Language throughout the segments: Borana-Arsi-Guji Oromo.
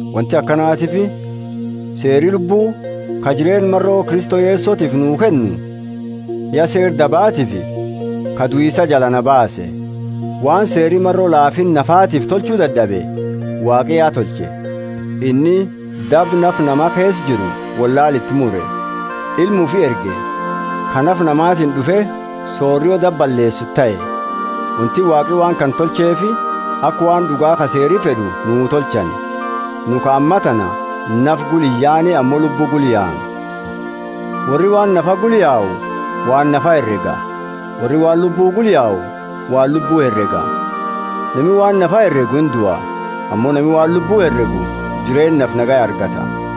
Wonti akanatiifi seeri Lubbu, ka jireenna maro Kristo Yesotiifi nuu kennu, ya seera dabaatiifi ka duisa jala naa baase. Waan seeri maro laafinna nafatiifi tolchu dad'abe, Waaqi ya tolche. Inni daba nafa nama keesa jiru wollaala iti mure, Ilma ufi erge, ka nafa namatiini d'ufe sorio daba balleesitu tahe. Wonti Waaqi waan kana tolcheefi, aka waan d'uga ka Seeri fed'u nuu tolchani, nu ka ammatana nafa gula iyaane ammo Lubbu gula yaanu. Worri waan nafa gula yau waan nafa herega. Worri waan Lubbu gula yau waan Lubbu herega. Nami waan nafa heregu indua, ammo nami waan Lubbu heregu jireennafi nagaya argata.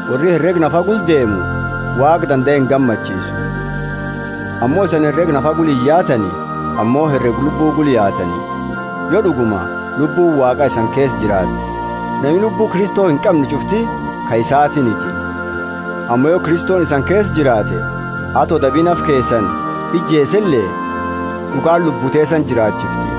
Worri herega nafa gula deemu Waaqa dandae ingammachiisu. Ammo isani herega nafa gula iyaatani, ammo herega Lubbu gula yaatani, yo d'uguma Lubbuuni Waaqa isani keesa jiraatte. Nami Lubbu Kristo inqamne ch'ufti ka isaatiiniti. Ammo yo Kristoni isani keesa jiraate, ato dabi nafa keesani ijeesele d'ugaani lubbu teesani jiraachifti.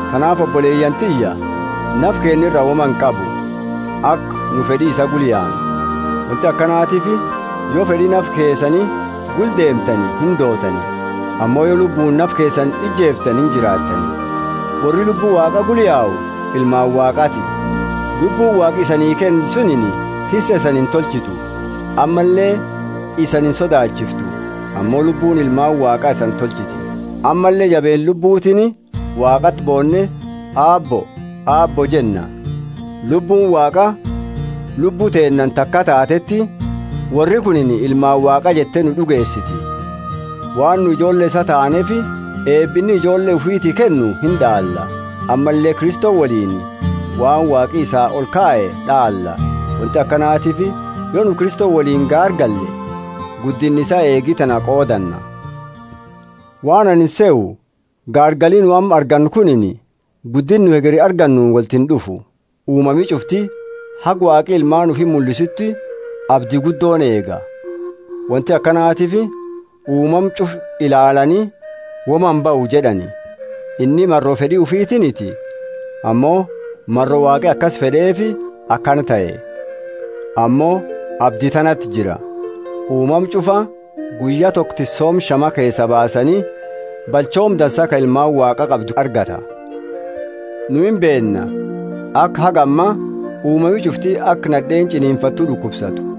Tanaafi oboleyaani tiyya, nafi keenna woma nura inqabu, aka nu fed'i isaa gula yaanu. Wonti akanatiifi yo fed'i nafa keesani gula deemtani indootani; ammo yo Lubbuuni nafa keesani ijeeftani injiraattani. Worri Lubbu Waaqa gula yau ilmaani Waaqaati. Lubbuuni Waaqi isanii kenne sunini tisse isani intolchitu ammalle isani insodaachiiftu; ammo Lubbuuni ilmaani Waaqa isani tolchiti, ammalle jabeenna Lubbutiini Waaqati boonne, Aabbo, Aabbo jenna. Lubbuuni Waaqa lubbu teennaani taka taateti, Worri kunini ilmaani Waaqa jette nu d'ugeesiti. Waan nu ijoolle isaa taaneefi eeba inni ijoolle ufiiti kennu ind'aalla, ammalle Kristo woliini waan Waaqi isaa olkaye d'aalla; wonti akanatiifi yo nu Kristo woliini gaargalle guddinna isaa eegi tana qoodanna. Waan anini sehu, gaargali nu amma argannu kunini guddinna nu hegeri argannuuni wolti ind'ufu. Uumami ch'ufti haga Waaqi ilmaani ufi mullisuuti abdi guddooni eega. Wonti akanatiifi uumama ch'ufa ilaallaani, Woma imbahu jed'ani. Inni maro fed'i ufitiiniti, ammo maro Waaqi akasi fed'eefi akana tahe. Ammo abdi tanati jira: uumama ch'ufaa guyya toko tissooma shama keesaa baasani, balchooma dansa ka ilmaani Waaqa qabdu argata. Nu imbeenna, aka haga amma uumami ch'ufti aka nad'eeni ch'ininfattu d'ukubsatu.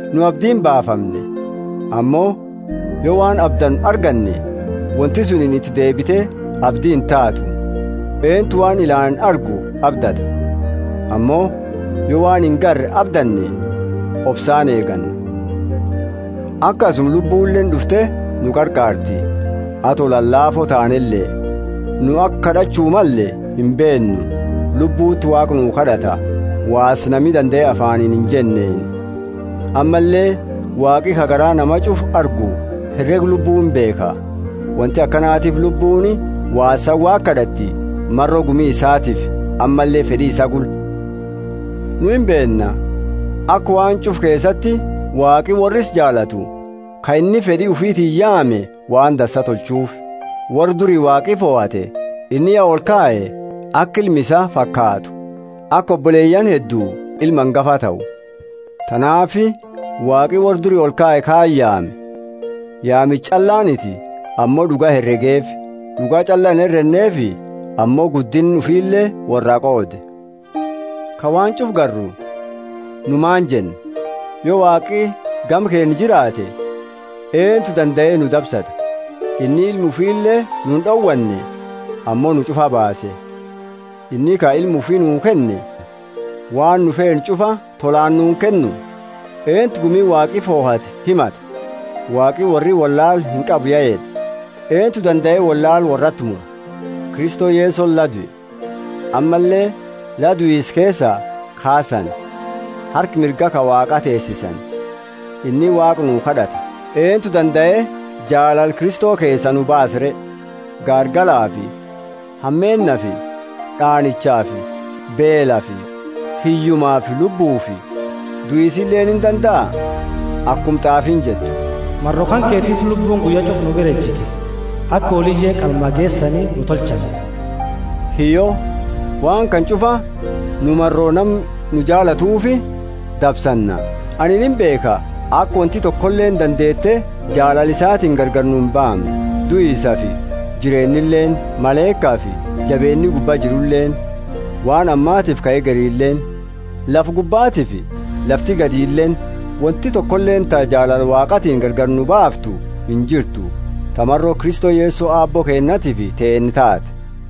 Nu abdiini baafamne; ammo yo waan abdannu arganne, wonti sunini iti deebite abdi intaatu. Eentu waan ilaani argu abdata? Ammo yo waan ingarre abdanne, obsaani eeganna. Akasuma Lubbuleeni d'ufte nu qarqaarti, ato lalaafo taanele. Nu aka kad'achu malle imbeennu; Lubbuti Waaqa nu kad'ata, waasa nami dandae afaaniini injenneeni. Ammalle Waaqi, ka garaa nama ch'ufa argu, herega Lubbu imbeekha. Wonti akanatiifi Lubbuuni waasaani Waaqa kad'atti maro gumi isaatiifi ammalle fed'i isaa gula. Nu imbeenna, aka waan ch'ufa keesati Waaqi worra isaa jaalatu, ka inni fed'i ufitiini yaame, waan dansa tolchuufi. Worra duri Waaqi fohate inni ya olkaye aka ilma isaa fakaatu aka oboleyaani hedduu ilmi angafa tahu. Tanaafi Waaqi worra duri olkaye kaani yaame; yaamicha ch'allaaniti ammo d'uga heregeefi; d'uga ch'alla inherenneefi ammo guddinna ufile worraa qoode. Ka waan ch'ufa garru, nu maani jenna? Yo Waaqi gama keenna jiraate, eentu dandae nu dabsata? Inni Ilma ufile nu ind'owanne, ammo nu ch'ufaa baase! Inni ka Ilma ufi nuu kenne, waan nu feenu ch'ufa tolaani nuu inkennu? Eentu gumi Waaqi fohate himata? Waaqi, Worri wollaala inqabu ya jed'e! Eentu dandae wollaala worrati mura? Kristo Yesoni la due, ammalle la duisa keesaa kaasani harka mirga ka Waaqa teesisani; inni Waaqa nu kad'ata. Eentu dandae jaalala Kristo keesaa nu baasa re? Gaargalafi hameennafi d'aanichafi beelafi hiyyumafi lubbufi duisileeni indandaa? Akuma t'aafiini jettu, Maro kanketiifi lubbuuni guyya ch'ufa nu bira ejiti, aka hooliye qalmaa geesani nu tolchani. Hiyyo, waan kana ch'ufa nu maro nama nu jaalatuufi dabsanna! Anini imbeekha, aka wonti tokoleeni dandeete jaalala isaatiini gargari nu imbaamne: duisafi jireennileeni; malaikafi jabeenni gubbaa jiruleeni; waan ammatiifi ka hegerileeni; lafa gubbatiifi lafti gadileeni — wonti tokoleeni ta jaalala Waaqaatiini gargari nu baaftu injirtu, ta maro Kristo Yeso Aabbo keennatiifi teenna taate.